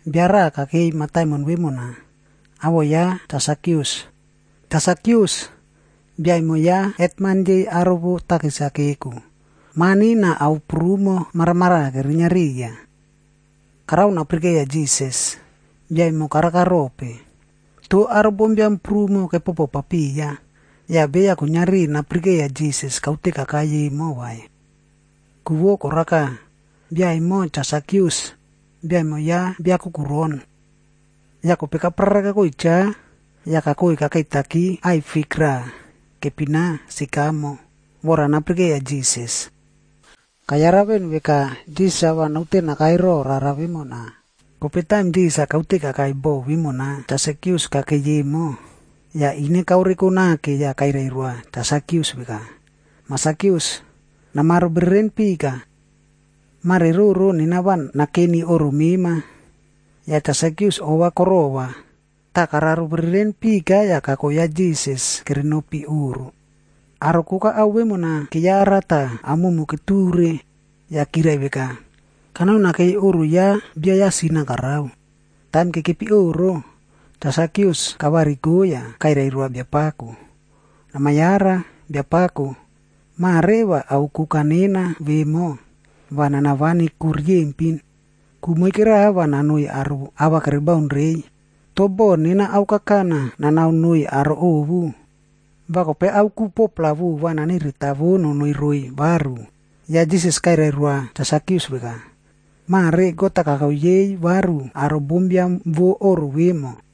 Bia raꞌa kakei mataimon vemona, awoꞌo ya Cha Sakius. Cha Sakius, bia emo ya hetman yei aro vo takis-a keko, mani na ao prumo maramaraꞌa kerinia riya. Karao napirikeiya Jisas, bia emo karaka rope. Toh aro bombiam prumo kepopo papiya, yah beya kuiniari napirikeiya Jisas kaute kakai emo vai. Ku vo koraka, bia vemona Cha Sakius, bia emo ya bia kukuron. Yah kope kaprara kakoi cha, yah kakoi kakeitaki aꞌai fik raꞌa, kepina “sikamo”, vora napirikeiya Jisas. Kayara veꞌen veka, Jisas-a va naute nakai ro rara vemona. Kope taim Jisas-a kaute kakai bo vemona Cha Sakius kakei emo, yah ine kaoreko nake yah kairai roa Cha Sakius veka, “Mah Sakius, namaro bereren pika. Mare roro nena va nakeni oꞌro mema.” Yah Cha Sakius ova korova, tah kararo bereren pika yah kako ya Jisas kerenopi oꞌro. Aro koka ao vemona keyara tah aomumu keture, yah kirai veka, “Kanoi nakei oꞌro ya bia ya sin-a karao.” Taim kekepi oꞌro, Cha Sakius kavariko yah kairai roa Biapako, “Nama yara, Biapako! Mare va ao koka nena vemo, va nana vani ku riyempin. Ku moike raꞌa va nanoiy aro ava kere baun reiy. Toh boh nena ao kakana nanao noiy aro ovu, va kope ao ku 4-pla vova naneretawo nonoi roiy varu.” Yah Jisas kairai roa Cha Sakius veka, “Mare God-a kako yei varu aro bombiam vo oꞌro vemo.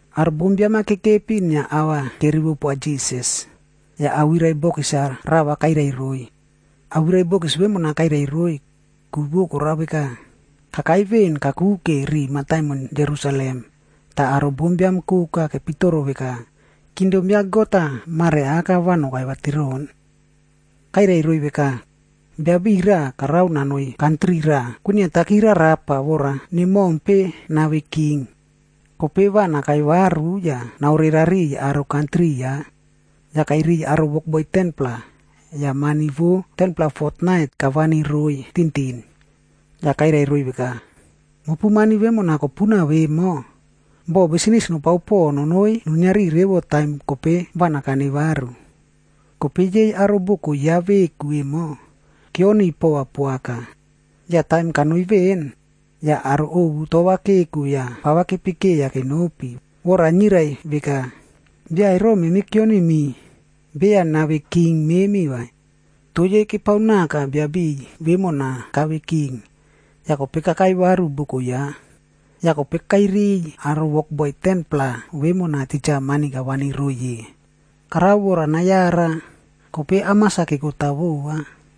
Aro bombiam-a kekepi inia ava kerivo poa Jisas, yah awirai bokis-a rava kairai roiy. Awirai bokis vemona kairai roiy, ku vo korao veka, kakai veꞌen kakuke ri mataimon Jerusalem, tah aro bombiam koka kepitoro veka, kingdom ya God-a mare aka va kokai vatiroꞌon. Kairai roiy veka, “Biabiꞌiy raꞌa karao nanoi kantri raꞌa kwiniaki rarapa vora nemompe nave king, kope va nakai varu yah naore rariꞌiy aro kantri ya. Yah kairiy aro wokboi 10-pla, yah mani vo 10-pla fotnait kavani roiy tintin. Yah kairai roiy veka, ‘Mopu mani vemona kopuna vemo, bo bisnis nopao po nonoi nuiniari revo taim kope va nakane varu.’ “Kope yei aro boko ya veku vemo, keoniy pova poaka. Yah taim kanoi veꞌen, yah aro ovu tova keko yah pava kepikeiya kenopi vora nirai veka, ‘Bia ero memi keonimi, beya nave king memi vai.’ “Toh yei kepao naka biabiꞌiy vemona kave king, yah kope kakai varu boko ya. Yah kope kairiy aro wokboi 10-pla vemona titja mani kavani roiy ye. Karao vora nayara, kope amas-a kekota vova.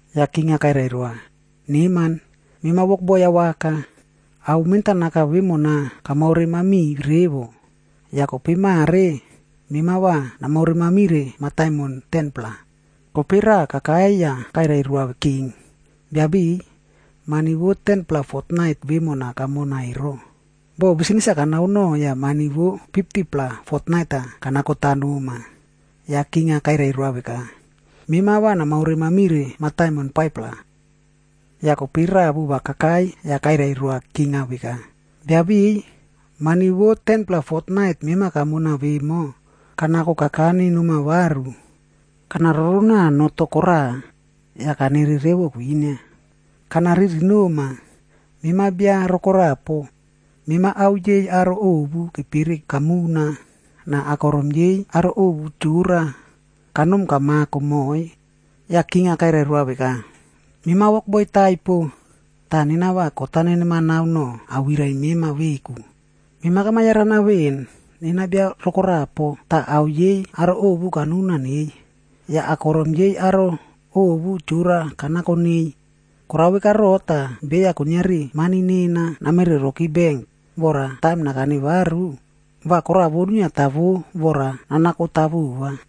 “Yah king-a kairai roa, ‘Neman, mema wokboi awaka. Ao mentanaka vemona kamaore mamiꞌi revo. Yah kope mare, mema va namaore mamire mataimon 10-pla.’ “Kope raꞌa kakai yah kairai roa king, ‘Biabiꞌiy, mani vo 10-pla fotnait vemona kamona ero, bo bisnis-a kanao no yah mani vo 50-pla fotnait-a kanakota noma.’ “Yah king-a kairai roa veka, ‘Mema va namaore mamire mataimon 5-pla.’ “Yah kope raꞌa vova kakai yah kairai roa king-a veka, ‘Biabiꞌiy, mani vo 10-pla fotnait mema kamona vemo, kanako kakane noma varu. Kana roronao noh to koraꞌa, yah kanere revo kwinia. Kana riri noma, mema bia rokorapo. Mema ao yei aro ovu kepere kamuna, na akorom yei aro ovu chora, kanom kamako moꞌoiy.’ “Yah king-a kairai roa veka, ‘Mema wokboi taipo, tah nena va kot-a nenemanao noꞌo awirai mema veku. Mema kama yarana veꞌen, nena bia rokorapob tah ao yei aro ovu kanuna neiy, yah akorom yei aro ovu chora kanako neiy. Korao veka roꞌo tah beya kuiniari mani nena namere roki benk, vora taim nakane varu, va koraꞌa vo nuiniatavo vora nanakota vova.’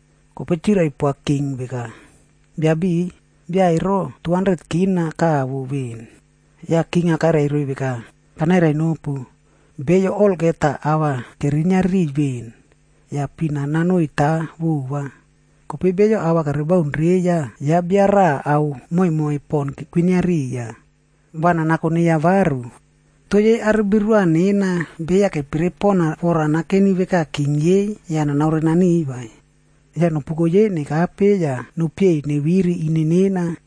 “Kope chirai poa king veka, ‘Biabiꞌiy, bia ero K200.00 kavo veꞌen!’ “Yah king kairai roiy veka, ‘Kanairai nopu, beyo olgeta ava kerinia riꞌiy veꞌen, va pina nanoiy ta vova. Kope beyo ava kere baun reiya yah bia raꞌa ao moimoi pon kwinia riya, va nanako neiya varu. Toh yei aro birua nena beya kepere pona vora nakeni veka king yei yah nanaore naniꞌiy vai. Yah nopuko yei nokape yah nopieiy neviri ine nena.’”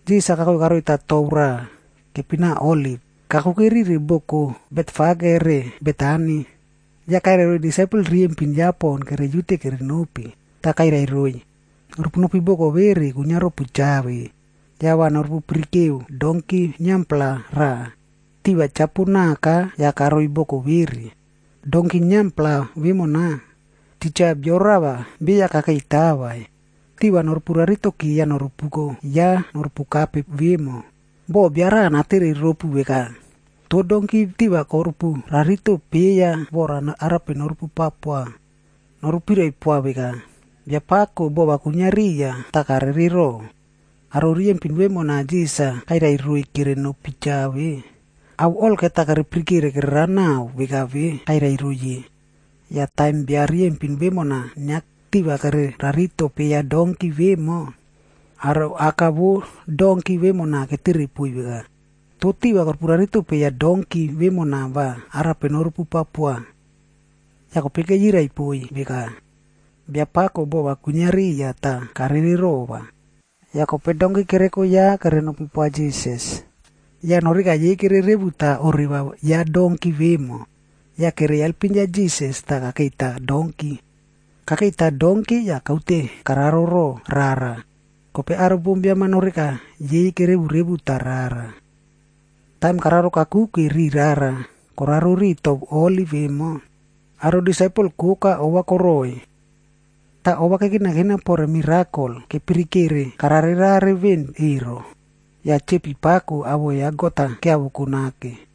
Jisas-a kakoi karoita tou raꞌa, kepina Oliv, kakuke rire boko Betfage re Betani, yah kairai roiy disaipel riyempin ya pon keriute kere nopi. Tah kairai roiy, “Norupu nopi boko vere kwinia ropu cha ve. Yah va norupu pirikeu donki niampla raꞌa, tiva chapo naka yah karoi boko vere. Donki niampla vemona, titja bio rava beya kakeitaka vai. Tiva noropu raritoki yah norupuko ya norupu kape vemo. Boh bia raꞌa natere ropu veka, ‘Toh donki tiva korupu rarito peiya vora arape norupu pao poa?’ Noru pirai poa veka, ‘Biapakoc bova kwinia riya tah karere rova.’” Aro riyempin vemona Jisas-a kairai roiy kere nopi cha ve, ao olgeta kere pirikere kererao naꞌao veka ve kairai roiy ye. Yah taim bia riyempin vemona inia tiva kere rarito peiya donki vemo, aro aka vo donki vemona ketere poiy veka, “Toh tiva korupu rarito peiya donki vemona va arape norupu pao poa?” Yah kope keyirai poiy veka, “Biapako bova kwinia riya tah karere rova.” Yah kope donki kereko ya kere nopi poa Jisas. Yah noh reka yei kere revuta oreva ya donki vemo, yah kere alpim ya Jisas tah kakeita donki. Kakeita donki yah kaute kararo roꞌo rara, kope aro bombiam-a noh reka yei kerevu revuta rara. Taim kararo kakuke ri rara koraro ri tou Oliv emo, aro disaipel koka ova koroꞌoiy. Tah ova kekinakina pore mirakol kepirikere karare rare veꞌen ero, yah chepi pako awoꞌo ya God-a kiavoko nake.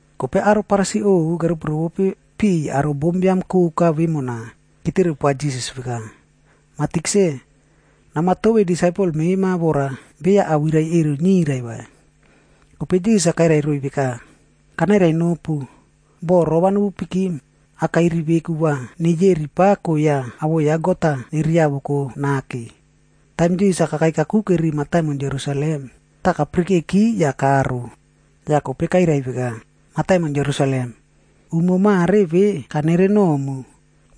Kope aro Farisi ovu keropi rovope piꞌiy aro bombiam koka vemona, ketere poa Jisas veka, “Mah Tikse, nama tovei disaipel mema vora beya awirai ero niyrai vai.” Kope Jisas-a kairai roiy veka, “Kanairai nopu, boh rova nepikim, akairi veku va neyeri pako yah awoꞌo ya God-a neriavoko nake.” Taim Jisas-a kakai kakuke ri mataimon Jerusalem,e tah kapirikeki yah karo. Yah kope kairai veka, “Mataimon Jerusalem, umo mare ve kanere nomu,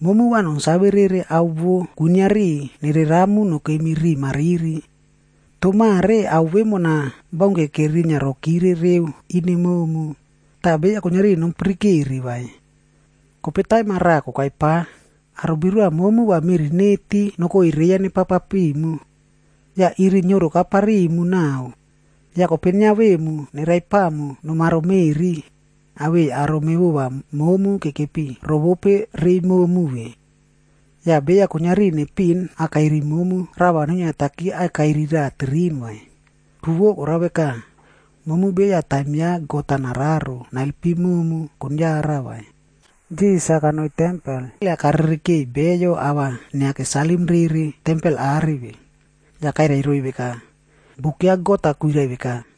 momu va nonsave rere ao vo kuiniari nereramu nokemi riꞌi mariri. Toh mare ao vemona baunke kerinia rokire reu ine momu, tah beya kuiniari nopirikere vai. Kope taim-a raꞌa kokai pa, aro birua momu va meꞌri neti nokoi reiya nepao papimu. Yah iri nioroka parimu naꞌao. Yah kope niavemu neraipamu nomaro meꞌri, awei aro mevova momu kekepi rovope rei momu ve. Yah beya kuiniari nepiꞌin akairi momu rava nuniata akairi raꞌa tirin vai. Ku vo karao veka, momu beya taim ya God-a nararo naelpim momu konyara vai.” Jisas-a kanoi tempel yah karere keꞌeiy beyo ava inia kesalim rere tempel are ve. Yah kairai roiy veka, “Buk ya God-a kwirai veka,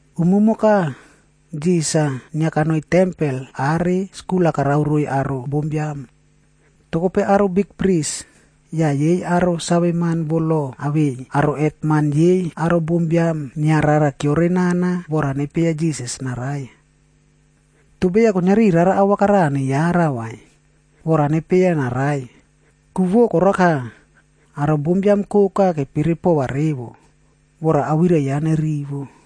Umumoka, Jisas-a inia kanoi tempel are skul-a karao roiy aro bombiam. Toh kope aro bikpris,h yah yei aro saveman vo lo awei aro hetman yei aro bombiam inia rara kiore nana vora nepieya Jisas-a narai. Toh beya kuiniari rara awaka rava neyara vai, vora nepieya narai. Ku vo koraka, aro bombiam koka kepere pova revo, vora awirai ya nerivo.